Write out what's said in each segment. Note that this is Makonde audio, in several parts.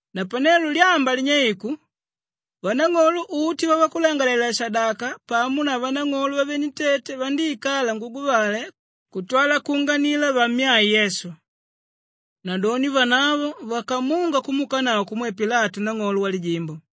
Napanelo lyamba linyeiku, vanang'olo uti vavakulangalalela-shadaka pamo na vanang'olo vavenentete vandíikala nguguvale kutwala kuunganila vammyae Yesu. Nadoni vanavo vakamunga kumuukanavo kumwe Pilatu nang'olo walijimbo.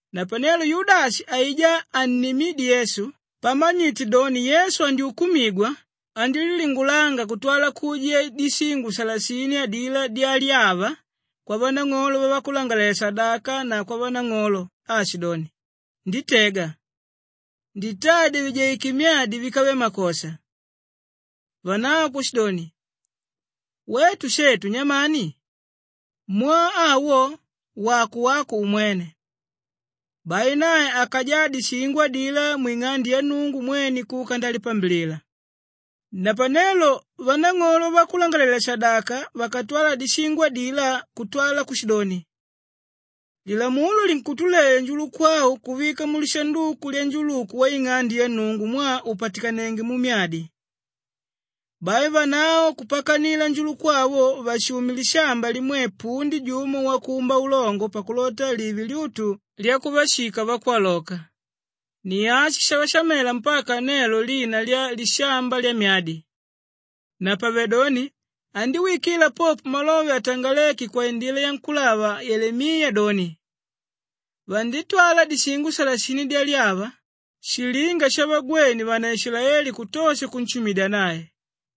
Napanelo Yudashi aijá annimídye Yesu, pamanyite doni Yesu andyukumigwa andílilingulanga kutwala kuujiya dishingo salasini adilá dyalyava kwavanang'olo vavakulangalalela-shadaka na kwavanang'olo aashidoni, “Nditega. Nditadya vijaike myadi víkave makosha.” Vanavo kushidoni, “Wetu shetu nyamani? Mwaa awo wako wako umwene.” Bai nae akajaa dishingo adilá mwing'ande ya Nnungu mwene kuka ndalipambilila. Napanelo vanang'olo vavakulangalalela-shadaka vakatwala dishingo adilá kutwa kushidoni, “Lilamulo linkutuleya njuluku au kuvika mulishanduku lyanjuluku waing'ande ya Nnungu mwaa upatikanenge mumyadi.” Bai vanavo kupakanila njuluku awo vashume lishamba limwe pundi jumo wakumba ulongo pakulota live lyutu lyakuvashika vakwaloka. Ni ashi shavashamela mpaka nelo lina lya Lishamba Lyamyadi. Napavedoni andíwikila popo malove atangaléke kwaindila yankúlava Yelemiya doni, “Vanditwala dishingo salasini dyalyava, shilinga shavagwene vanaishilaeli kutosha kunshumidya nae.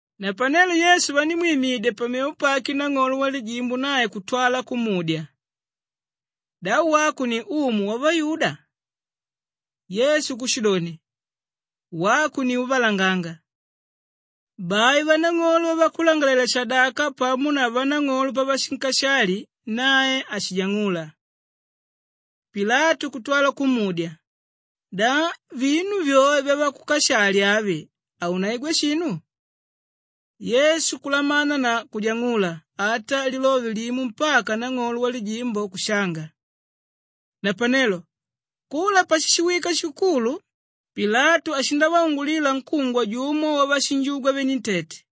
Napanelo Yesu vandímwimidya pamevo pake nang'olo walijimbo nae kutwala kumudya, “Da wako ni umu wavayuda?” Yesu kushidoni, “Wako ni úvalanganga.” Bai vanang'olo vavakulangalalela-shadaka pamo na vanang'olo pavashinkashali, nae hashijang'ula. Pilatu kutwala kumudya, “Da vinu vyoe vyavakukashali avi haunaigwa shinu?” Yesu kulamana na kujang'ula ata lilove limo mpaka nang'olo walijimbo kushanga. Napanelo kula pashishiwika shikukulu, Pilatu ashindavaungulila nkúngwa jumo wavashinjugwa venentete.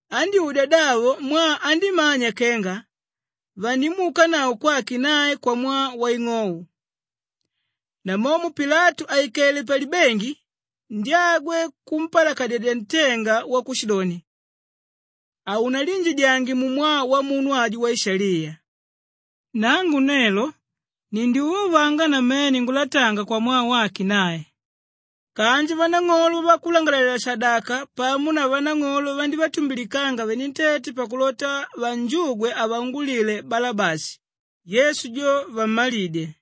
Andyúdya davo mwaa andímanya kenga vandimuukanavo kwake nae kwamwaa waing'ou. Namomo Pilatu àikele palibengi, ndyagwe kumpalakadyedya ntenga wakushidoni, “Haunaliinjidyange mumwaa wamunu ajo waishaliya. Nangu nelo nindyuvauvanga namene ngulatanga kwamwaa wake nae.” Kanji vanang'olo vavakulangalalela-shadaka pamo na vanang'olo vandívatumbilikanga venentete pakulota vanjugwe avaungulile Balabashi, Yesu jo vammalidye.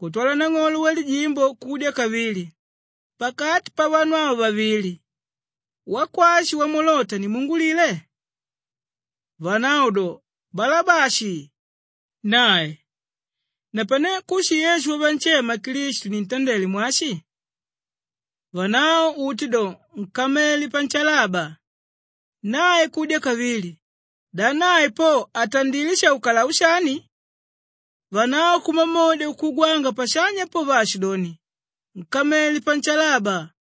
Kutwala nang'olo walijimbo kudya kavili, “Pakati pavanu ava vavili, wakwashi wamulota nimuungulile?” Vanavo do, “Balabashi!” Nae, “Napane kushi Yesu wavanshema Klistu nintandele mwashi?” Vanavo uti do, “Nkamele panshalaba!” Nae kudya kavili, “Da nae po atandilé shaukalau shani?” Vanavo kumamodya kukugwanga pashanya po, vaashidoni, “Nkamele panshalaba!”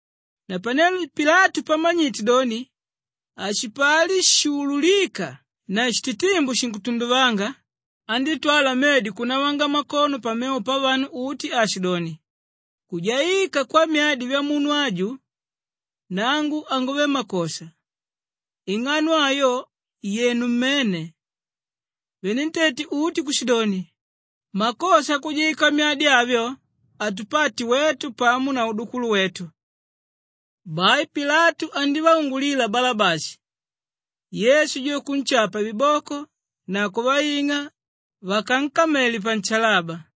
Napanelo Pilatu pamanyite doni hashipali shuululika na shititimbu shinkutunduvanga, andítwala medi kunavanga mmakono pamevo pavanu uti aashidoni, “Kujaika kwamyadi vyamunu aju, nangu hanguve makosha. Ing'ano ayo yenu mmene.” Venentete uti kushidoni, “Makosha akujaika myadi avyo atupate wetu pamo na udukulu wetu.” Bai Pilatu andívaungulila Balabashi, Yesu jo kunshapa viboko na kuvaing'a vakankamele panshalaba.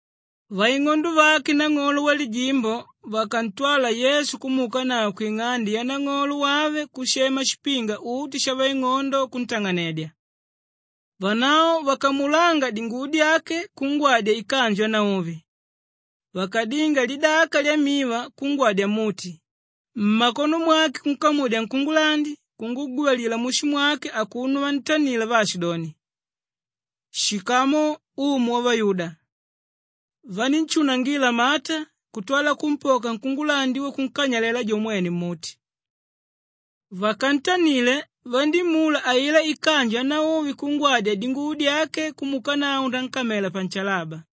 Vaing'ondo vake nang'olo walijimbo vakantwala Yesu kumuukanavo kwing'ande yanang'olo wave kushema shipinga uti shavaing'ondo kuntang'anedya. Vanavo vakamulanga dinguvo dyake kungwadya ikanju yanauvi. Vakadinga lidaka lyamiva kungwadya mmuti, mmakono mwake kunkamudya nkungulandi, kunguguvalila mushu mwake akuno vantanila vaashidoni, “Shikamu Umu wavayuda!” Vanínshunangila mata kutwala kumpoka nkungulandi wo kunkanyalela jo mwene mmuti. Vakantanile, vandímula ailá ikanju yanauvi kungwadya dinguvo dyake kumuukanavo nankamela panshalaba.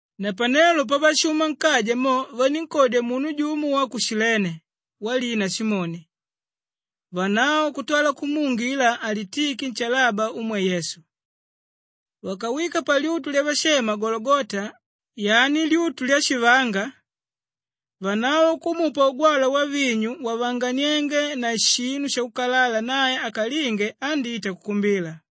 Napanelo pavashuma nkaja mo vanínkodya munu jumo wa ku Shilene walina Simoni, vanavo kutwala kumuungila alitike nshalaba umwe Yesu. Vakawika palyutu lyavashema Gologota, yani lyutu lyashivanga, vanavo kumupa ugwalwa wavinyu wavanganiénge na shinu shakukalala nae akalinge andíta kukumbila.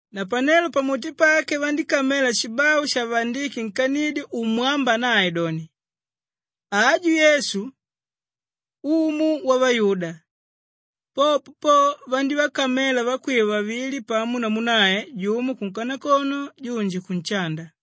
Napanelo pamuti pake vandíkamela shibau shavaandike nkanidyo umwámba nae doni, “Aju Yesu, Umu Wavayuda.” Popo po, vandívakamela vakwiva vavili pamo namu nae, jumo kunkanakono junji kunshanda.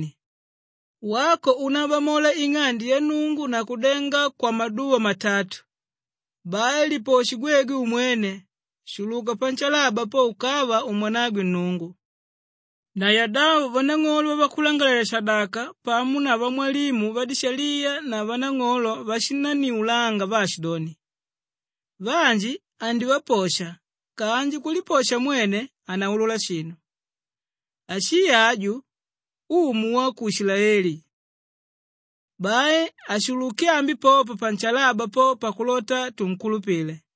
vaashidoni, “Wako únabamola ing'ande ya Nnungu na kudenga kwamaduva matatu, bai liposhe gwegwe umwene! Shuluka panshalaba po ukava umwanangwe Nnungu!” Na yadavo vanang'olo vavakulangalalela-shadaka pamo na vamwalimu vadishaliya na vanang'olo vashinanniulanga vaashidoni, “Vanji andivaposha kanji kuliposha mwene hanaulula shinu. Ashii aju, Umu wa ku Ishilaeli! Bai ashuluke ambi popa panshalaba po pakulota tunkulupile.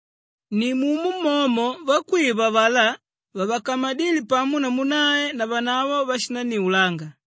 Nimumo momo vakwiva avalá vavakamadíle pamo namu nae navanavo vashinanniulanga.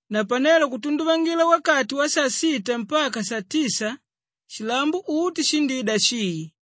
Napanelo kutunduvangila wakati wasasita mpaka satisa shilambo uti shindida shii.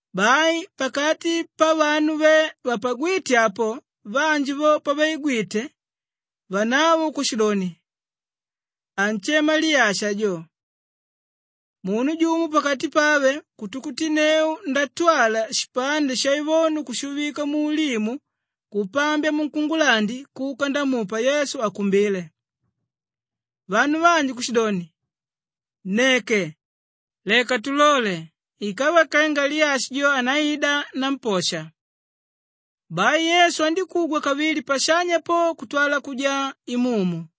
Bai pakati pavanu ve vapagwíte apo vanji vo pavaigwite, vanavo kushidoni, “Anshema Liyashi ajo.” Munu jumo pakati pave kutukutinneu ndatwala shipande shaivonu kushuvika muulimu, kupambya munkungulandi kuka ndamupa Yesu akumbile. Vanu vanji kushidoni, “Nneke! Leka tulole ikava kenga Liyashi jo andaida namposha.” Bai Yesu andíkugwa kavili pashanya po kutwala kujaa imumu.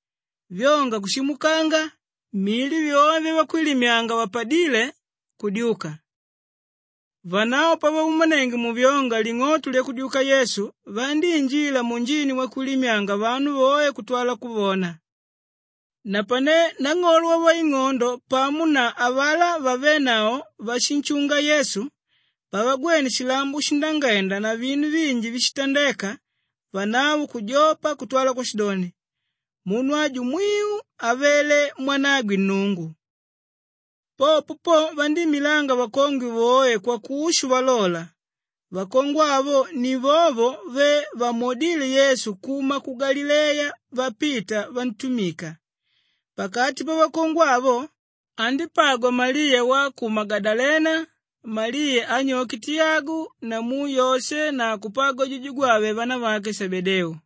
Vyonga kushimukanga, mili vyoe vyavakwilimyanga vapadíle, kudyuka. Vanavo pavaumanenge muvyonga ling'oto lyakudyuka Yesu, vandíinjila munjini wakwilimyanga vanu voe kutwala kuvona. Napane nang'olo wavaing'ondo pamo na avalá vavénavo váshinshunga Yesu, pavagwene shilambo shindangenda na vinu vinji víshitandeka, vanavo kujopa kutwala kushidoni, “Munu aju mwiu avele mwanagwe Nnungu.” Popo po vandíimilanga vakongwe voe kwakushu valola, vakongwe avo ni vovo ve vamwodíle Yesu kuma ku Galileya vapita vantumika. Pakati pavakongwe avo, andípagwa Maliya wa ku Magadalena, Maliya anyoke Tiyagu namu Yoshe na kupagwa jujugwave vanavake Shebedeu.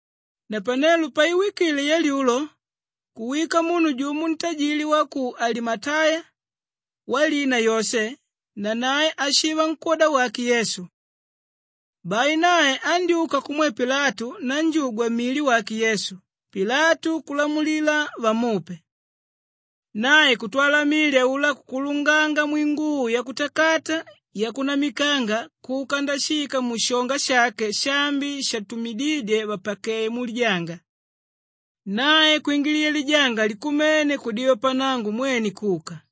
Napanelo paiwikile yalyulo kuwika munu jumo ntajili wa ku Alimateya walina Yoshe, nanae ashiva nkwóda wake Yesu. Bai nae andyúka kumwe Pilatu ndajugwa mili wake Yesu, Pilatu kulamulila vamupe. Nae kutwala mili aulá kukulunganga mwinguvo yakutakata yakunamikanga kuka ndashika mushonga shake shaambi shatumidídye vapakeye mulijanga. Nae kwingiliya lijanga likumene kudiva pannango, mwene kuka.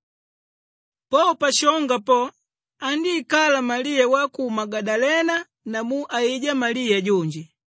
Po pashonga po, andíikala Maliya wa ku Magadalena namu aijá Maliya junji.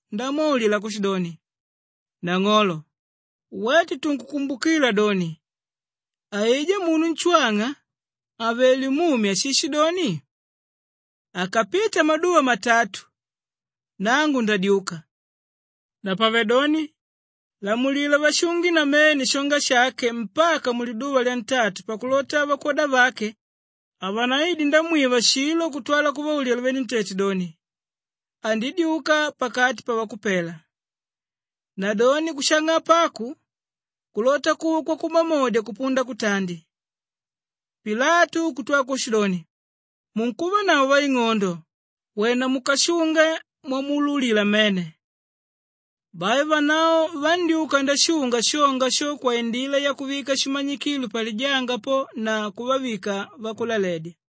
ndamwaulila kushidoni, “Nang'olo, wetu tunkukumbukila doni aijá munu nshwang'a àvele mumi ashishidoni, ‘Akapita maduva matatu, nangu ndadyuka.’ Napavedoni lamulila vashunge namene shonga shake mpaka muliduva lyantatu pakulota vakwoda vake havanaide ndamwiva shilo kutwala kuvaulila venentete doni, ‘Andidyuka pakati pavakupela.’ Nadoni kushang'apa aku kulota kuva kwakumamodya kupunda kutandi.” Pilatu kutwala kushidoni, “Munkuvanavo vaing'ondo, wena mukashunge mwamuululila mmene.” Bai vanavo vandyúka ndashunga shonga sho kwaindila yakuvika shimanyikilo palijanga po na kuvavika vakulaledya.